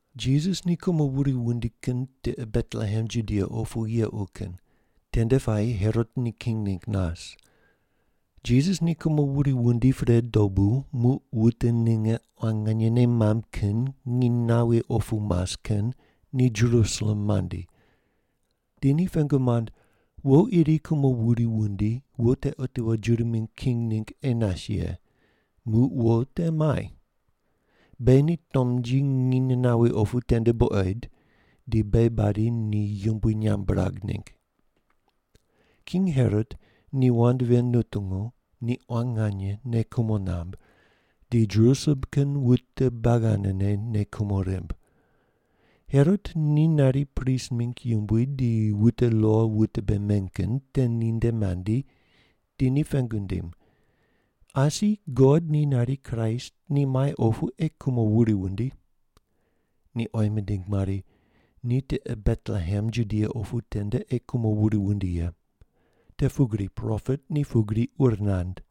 Jisas ni kumo wuri wundi kin tiqe Betlehem Judia opu yequ kin, tende puayi Herot ni king ningg nas. Jisas ni kumo wuri wundi pre dobu, muq wute ninge quan nganye nei mamb kin nginy nawi opu mas kin ni Jerusalem mandi. Di ni pengu mand, “Wo iri kumo wuri wundi, wo te otiwo Juda mingg king ningg ei nas ye. Muq wo te muai? Beghi ni tomnji nginy nawi opu tende buqoid di beghi badi ni yumbui nyamb birag ningg.” King Herot ni wand ven nutungu, ni quan nganye nei kumo namb, di Jerusalem kin wute buagi anene nei kumo rimb. Herot ni nari prist mingg yumbui di wute lo wute bei meny kin te ninde mandi di ni pengu nindim, “Asi God ni nari Kraist ni muai opu ei kumo wuri wundi?” Ni oyi mindig mari, “Ni tiqe Betlehem Judia opu tende ei kumo wuri wundi ye. Te pugri propet ni pugri ur nand: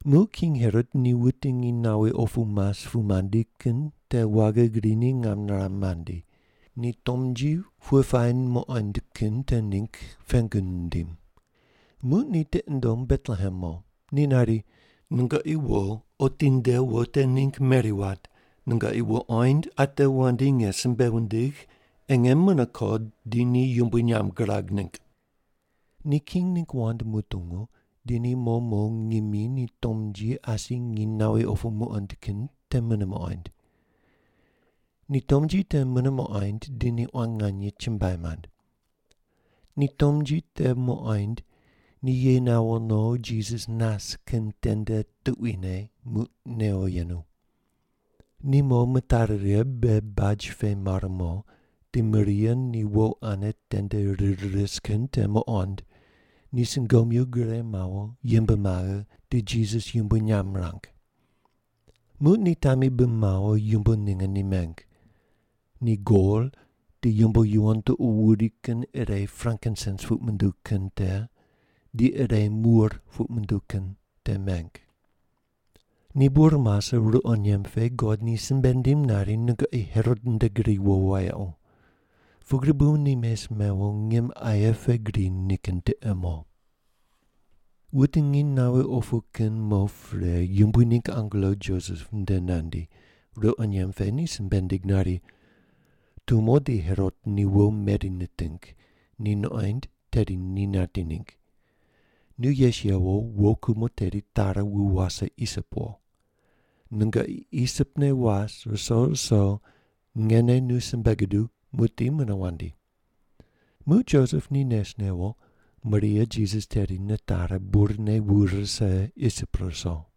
Muq king Herot ni wute nginy nawi opu mas pu mandi kin te waghi grine ngam niram mandi, ni tomnji pughe puayi muqoind kin te kin ningg pengu nindim. Muq ni tiqi nundom Betlehem mo. Ni nari, “Nungoqi wo, otinde wo te ningg meri wat, nungoqi wuqoind, ate wandi nge simbe wundigh, ei nge mune ko di ni yumbui nyamb girag ningg.” Ni king ningg wand mutungu, di ni mo mo ngimi ni tomnji asi nginy nawi opu muqoind kin te mune muqoind. Ni tomnji te mune muqoind di ni quan nganye chumbuai mand. Ni tomnji te muqoind, ni ye nawo no Jisas nas kin tende tuquine muq newo yenu. Ni mo mitari righe be baj pe mar mo, di Maria ni wo ane tende rir ris kin te muqond, ni sungomyu gure mawo, yimb maghe, di Jisas yumbui nyamb mirang. Muq ni tami bi mawo, yumbo ninge ni meng. Ni gol, di yumbo yuwon tuqo wuri kin ire frankinsens puq munduw kin te, di ire mur puq munduw kin te meng. Ni bur mase, ruqo nyemb pe God ni simbe nindim nari, “Nungoqi Herot nde gri wo wayequ.” Pugri bu ni mes mewo, ngim aye pe gri nikin tiqe mo. Wute nginy nawi opu kin mo pre Yumbui ningg angelo Josep nde nandi, ruqo nyemb pe ni simbe nindig nari, “Tumo di Herot ni wo meri niting, ni nuqoind tedi ni nati ningg. Nu yes yewo, wo kumo teri tari wu wase Isip wo. Nungoqi Isip ne was ruso ruso ngene nu simbe guduw, muqdi mune wandi.” Muq Josep ni nes newo, Maria Jisas teri nitari, burne wu rise Isip ruso.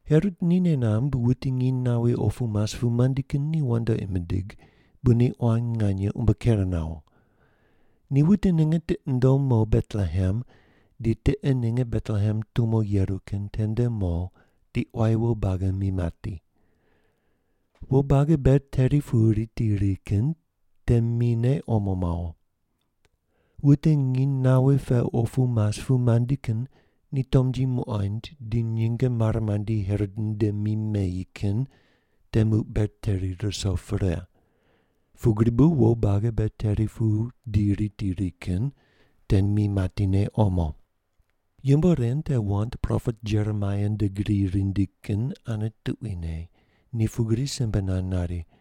Herot ni nei namb wute nginy nawi opu mas pu mandi kin ni wandoqi mindig, bu ni quan nganye umbo ker nawo. Ni wute ninge tiqi nundom mo Betlehem di tiqe ninge Betlehem tumo yeru kin tende mo di quayi wo buagi mi mati. Wo buagi ber teri pu riti ri kin te mine omo mawo. Wute nginy nawi pe opu mas pu mandi kin ni tomnji muqoind di nyinge mare mandi Herot nde mi meyi kin te muq ber teri ruso pre. Pugri bu wo buagi ber teri pu di riti ri kin te mi matine omo. Yumbo ren te wand propet Jeremaia nde gri rindi kin ane tuquine, ni pugri simbe nand nari,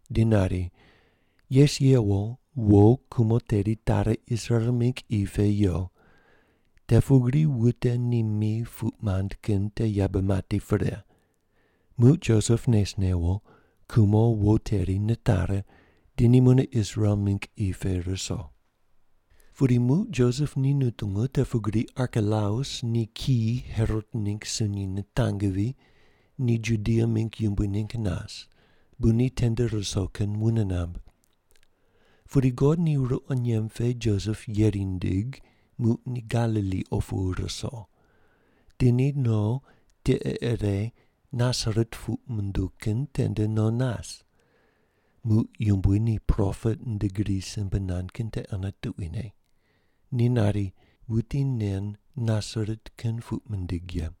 di nari, “Yes yewo, wo kumo teri tari Israel mingg qi pe yo, te pugri wute ni mi puq mand kin te yabe mati pre.” Muq Josep nes newo, kumo wo teri nitari di ni mune Israel mingg qi pe ruso. Pudi muq Josep ni nutungu te pugri Arkelaus ni kiyi Herot ningg sunyi nitangvi, ni Judia mingg yumbui ningg nas, bu ni tende ruso kin wune namb. Pudi God ni ruqo nyemb pe Josep yeri nindig, muq ni Galili opu ruso. Di ni no, tiqe ire Nasaret puq munduw kin tende no nas. Muq Yumbui ni propet nde gri simbe nand kin te ane tuquine. Ni nari, “Wuti nen Nasaret kin puq mindig ye.”